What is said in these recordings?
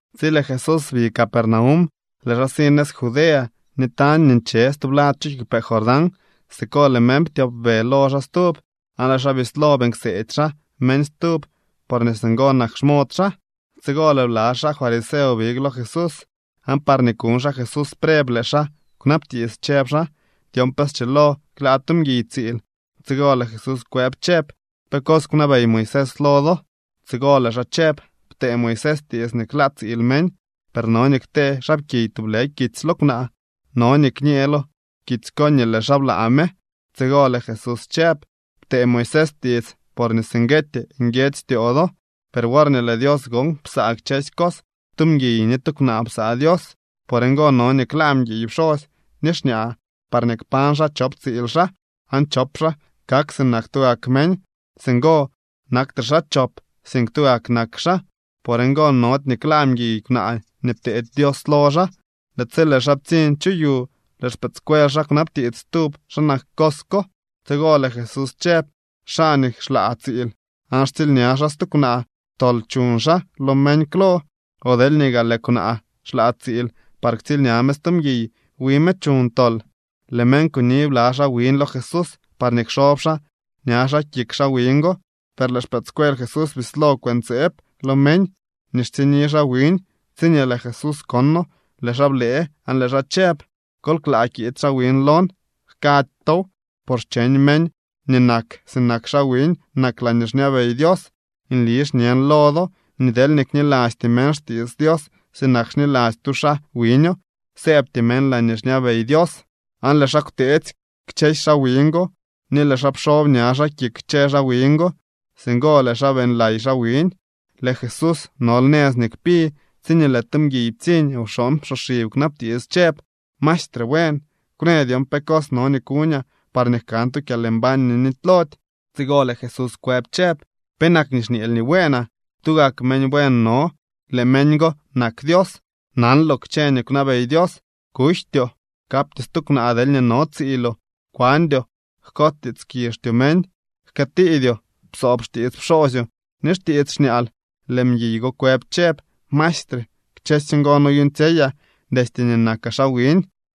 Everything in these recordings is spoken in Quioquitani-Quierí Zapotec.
Tsi lëë Jesús bi Capernaum, lëë xaa si nëz Judea ni tañ nii nche stublad chu kiigwpee Jordán. Siko lëë meñ ptyopbe lo xaa stub, aan lëë xaa bislo beeñ kseedy xaa meñ stub porñee singo nak xmod xaa. Tsigo lëë bla xaa fariseo big lo Jesús, aan parñee kuñ xaa Jesús preb lëë xaa kwnabtiits chëb xaa dyon pe schilo klaa tu mguiy tsiil. Tsigo lëë Jesús kwëb chëb: —¿Pe cos kwnabey Moisés lo do? Tsigo lëë xaa chëb: —Ptee Moisés tiits nii klaa tsiil meñ, per no nii ktee xaapkiy tublë kitsy lo kwnaa. No nii kñee lo kitsy ko nii lëë xaa blaa me. Tsigo lëë Jesús chëb: —Ptee Moisés tiits porñee singueetyee nguiedzy styoo do, per worñee lëë Dios gon psaa kchësy cos, “tu mguiy ni tu kwnaa psaa Dios.” Por ngo no nii klaa mguiy pxosy ni xñaa parñee kpañ xaa chop tsiil xaa aan chop xaa kak sinak tugak meñ. Singo naktre xaa chop, sink tugak nak xaa. Por ngo nody nii klaa mguiy kwnaa nii pteedy Dios lo xaa. Lëë tsi lëë xaa ptsiñ chu yu, lëë xpëëdscuel xaa kwnabtiits stub xa nak cos ko. Tsigo lëë Jesús chëb: —Xaa nii xlaa tsiil aan xtsiilña xaa stu kwnaa, tol chuñ xaa lo meñ klo. O deelñee gaa lëë kwnaa xlaa tsiil par ktsiilña me stu mguiy, wi me chuñ tol. Lëë meñ kuni bla xaa wiñ lo Jesús parñee kxob xaa ña xaa kik xaa wiñ go, per lëë xpëëdscuel Jesús bislo kwëntseeb lo meñ nii xtsiñni xaa wiñ. Tsiñee lëë Jesús kono, lëë xaa blëë aan lëë xaa chëb: —Kol klaa kiid xaa wiñ lon. Jkady tow, por xcheñ meñ nii nak sinak xaa wiñ nak laañee xñabey Dios. Nli xñen lo do nii deelñee knilasty meñ xtiits Dios sinak xniladzy tu xaa wiño, sëëbty meñ laañee xñabey Dios. Aan lëë xaa kwteetsy kchësy xaa wiñ go, ni lëë xaa pxob ña xaa kik kchë xaa wiñ go. Singo lëë xaa beeñlay xaa wiñ. Lëë Jesús nol nëz nii kpi, tsiñee lëë tu mguiy ptsiñ wxooñ psoxib kwnabtiits chëb: —Maestre buen, kwnë dyon pe cos no nii kuñaa parñee jkan tu kyalmbañ nii nitylody. Tsigo lëë Jesús kwëb chëb: —¿Penak nii xñeel nii bueenaa? Tugak meñ buen no. Lëë meñ go nak Dios. Nanloo kchë nii kwnabey Dios: “Kujtyoo, kaptyoo stu kwnaa deelñee no tsiiloo, kwandyoo, jkots tiits kizhtyoo meñ, jkëëtiidyoo, psoob xtiits pxoosyoo ni xtiits xñaal.” Lëë mguiy go kwëb chëb: —Maestre, kchësy ngo noyuuñtsyeyaa destye nii nakaa xaa wiñ.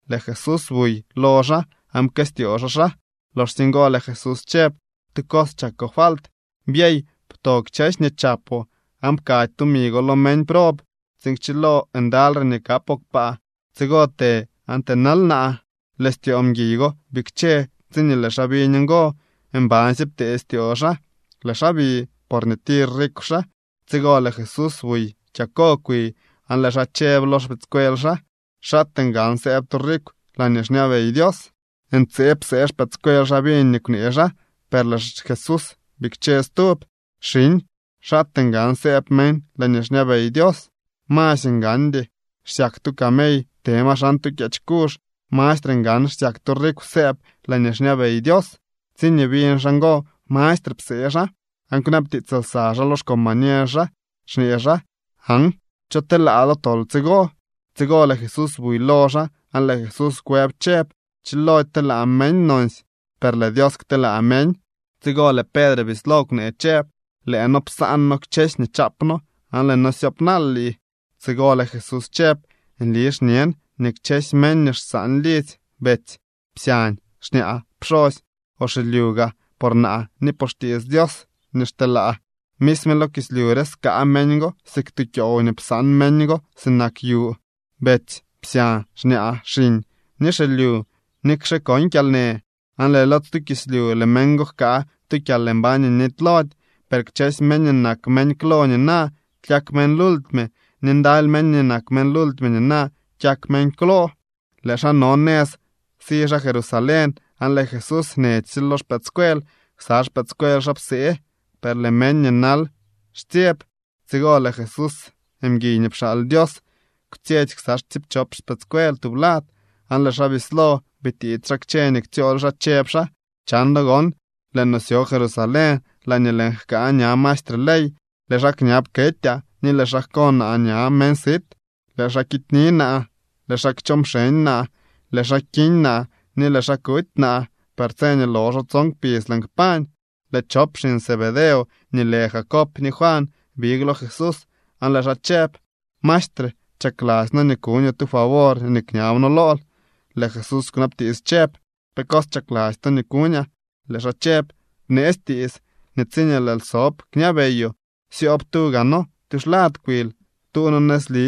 Lëë Jesús buy lo xaa aan pkëstyoo xaa xaa. Loxsye ngo lëë Jesús chëb: —Tu cos chakoo falt: Byey, pto kchësy nii chapoo aan pkady tumi go lo meñ prob tsiin kchilo ndalyre nii kapoo kpaa. Tsigo të aan tënal naa. Lëë styoo mguiy go bikche tsiñee lëë xaa biñ ngo. Mbansye ptee styoo xaa, lëë xaa bi, porñee tir rikw xaa. Tsigo lëë Jesús buy kyako kwi, aan lëë xaa chëb lo xpëëdscuel xaa: —¡Xaatee ngan sëëb tu rikw laañee xñabey Dios! Ntseeb psee xpëëdscuel xaa biñ nii kwnee xaa, per lëë Jesús bikche chëb: —Xiñ, ¡xaatee ngan sëëb meñ laañee xñabey Dios! Masy ngandy xsyak tu camey te ma xan tu kyeech kuzh. Mastre ngan xsyak tu rikw sëëb xaa laañee xñabey Dios. Tsiñee biñ xaa ngo, mastre psee xaa, aan kwnabtiits lsa xaa lo xcombañer xaa xñee xaa: —Aan ¿cho telaa lo tol tsigo? Tsigo lëë Jesús buy lo xaa aan lëë Jesús kwëb chëb: —Chilody telaa meñ nonsy, per lëë Dios kteelaa meñ. Tsigo lëë Pedre bislo kwnee chëb: —Lëë noo psaan noo kchësy nii chaap noo, aan lëë noo syoop naal lii. Tsigo lëë Jesús chëb: —Nli xñen nii kchësy meñ nii xsaan lidzy, betsy, psyañ, xñaa, pxosy, o xilyu gaa por naa ni por xtiits Dios nii xteelaa, misme lo kislyu re skaa meñ go siik tu kyoow nii psaan meñ go sinak yu, betsy, psyañ, xñaa, xiñ ni xilyu, nikxe con kyalnë. Aan lëë lo stu kislyu lëë meñ go jkaa tu kyalmbañ nii nitylody. Per kchësy meñ nii nak meñ klo nina, kyak meñ lultime. Ni ndaly meñ nii nak meñ lultime nina, kyak meñ klo. Lëë xaa no nëz si xaa Jerusalén, aan lëë Jesús nechsye lo xpëëdscuel. Ksa xpëëdscuel xaa psee, per lëë meñ nii nal xtsyeb. Tsigo lëë Jesús, mguiy nii pxaal Dios, kwtsyetsy ksa tsiipchop xpëëdscuel tublad aan lëë xaa bislo bitiits xaa kchë nii ktsyool xaa, chëb xaa: —Chan do gon lëë no syo Jerusalén laañee lëën jkaa ña maestre ley. Lëë xaa kñab ketyaa ni lëë xaa jko naa ña meñ sit. Lëë xaa kityni naa, lëë xaa kchoo mxeñ naa, lëë xaa kiñ naa ni lëë xaa kuty naa. Per tse nii loxo tson kpidz lëën kpañ. Lëë chop xiñ Zebedeo nii lë Jacob ni Juan big lo Jesús aan lëë xaa chëb: —Maestre, chakladzy noo nii kuñoo tu favor nii kñab noo lool. Lëë Jesús kwnabtiits chëb: —¿Pe cos chakladzy to nii kuñaa? Lëë xaa chëb: —Bneetsy tiits nii tsiñee lëël sob kñabeyoo, syoob tuu gaa noo tyuxlad kwil, tuu noo nëzli,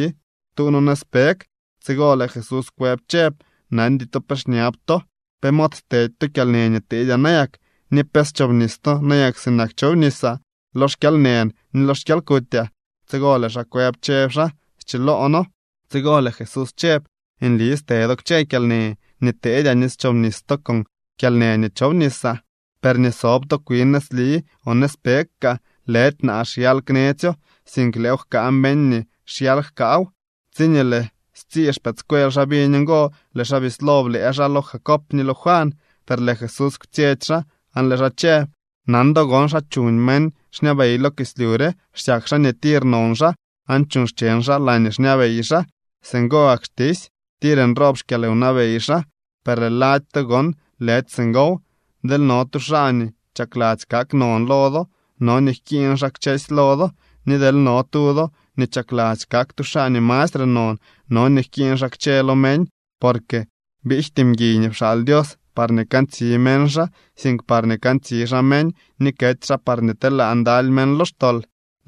tuu noo nëzpeg. Tsigo lëë Jesús kwëb chëb: —Nandy to pe xñab to. ¿Pe mod stedy to kyalnë nii teedyaa nayak, ni pe schobnis to nayak sinak chobnisaa lo xkyalnën ni xkyalkutyaa? Tsigo lëë xaa kwëb chëb xaa: —Schiloo noo. Tsigo lëë Jesús chëb: —Nli ste do kchë kyalnë nii teedyaa ni schobnis to con kyalnë nii chobnisaa. Per nii sob to kwin nëzli o nëzpeg kaa, lëdy naa xyal knetsyo, sink lëëw jkaa meñ nii xyal jkaaw. Tsiñee lëë stsii xpëëdscuel xaa biñ ngo, lëë xaa bislo blëë xaa lo Jacob ni lo Juan. Per lëë Jesús kwtsyetsy xaa aan lëë xaa chëb: —Nan do gon xa chuñ meñ xñabey lo kislyu re. Xsyak xaa nii tir non xaa aan chuuñ xcheñ xaa laañee xñabey xaa. Singo gak xtisy, tir nroob xkyalwnabey xaa. Per lëë lady to gon lëdy singow. Deel no tu xaa nii chakladzy kak non lo do, no nii jkiiñ xaa kchësy lo do. Ni deel no tu do nii chakladzy kak tu xaa nii mastre non, no nii jkiiñ xaa kchë lo meñ. Porque biijty mguiy nii pxaal Dios parñee kantsi meñ xaa, sink parñee kantsi xaa meñ ni kety xaa parñee telaa ndaly meñ lo xtol.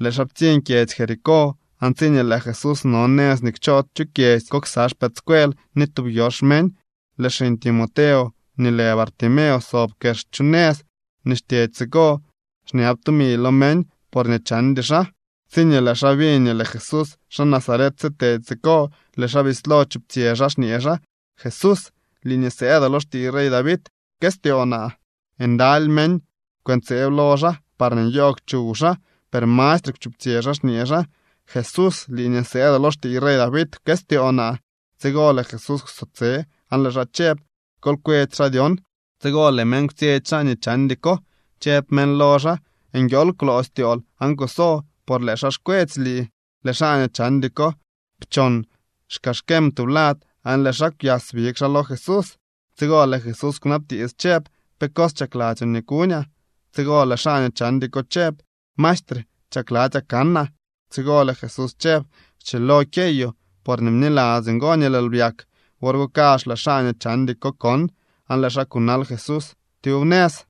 Lëë xaa ptsiñ kyedzy Jericó. Aan tsiñee lëë Jesús no nëz nii kchoo chu kyedzy ko ksa xpëëdscuel ni tub yox meñ, lëë xiñ Timeo nii lë Bartimeo sob kex chu nëz nii xtyedy siko xñab tumi lo meñ porñee chandy xaa. Tsiñee lëë xaa biñ nii lëë Jesús xaa Nazaret sitedy siko, lëë xaa bislo chuptsyë xaa xñee xaa: —¡Jesús, lii nii sëëdoo lo xtiiy rey David, pkëstyoo naa! Ndaly meñ kwëntseeb lo xaa parñee nyoogw chuw xaa, per mastre kwchuptsyë xaa xñee xaa: —¡Jesús, lii nii sëëdoo lo xtiiy rey David, pkëstyoo naa! Tsigo lëë Jesús kwso tse aan lëë xaa chëb: —Kol kwetsy xaa dyon. Tsigo lëë meñ kwtsyetsy xaa nii chandy ko, chëb meñ lo xaa: —Nguiool kwloo styool aan kuso, por lëë xaa xkwetsy lii. Lëë xaa nii chandy ko pchon xkaxkem tublad aan lëë xaa kwyas big xaa lo Jesús. Tsigo lëë Jesús kwnabtiits chëb: —¿Pe cos chakladzyoo nii kuñaa? Tsigo lëë xaa nii chandy ko chëb: —Maestre, chakladzyaa kanaa. Tsigo lëë Jesús chëb: —Schilo kyeyoo. Porñee bniladzyoo ngo nii lëël byak. Wor go kazh lëë xaa nii chandy ko kon, aan lëë xaa kunal Jesús tyub nëz.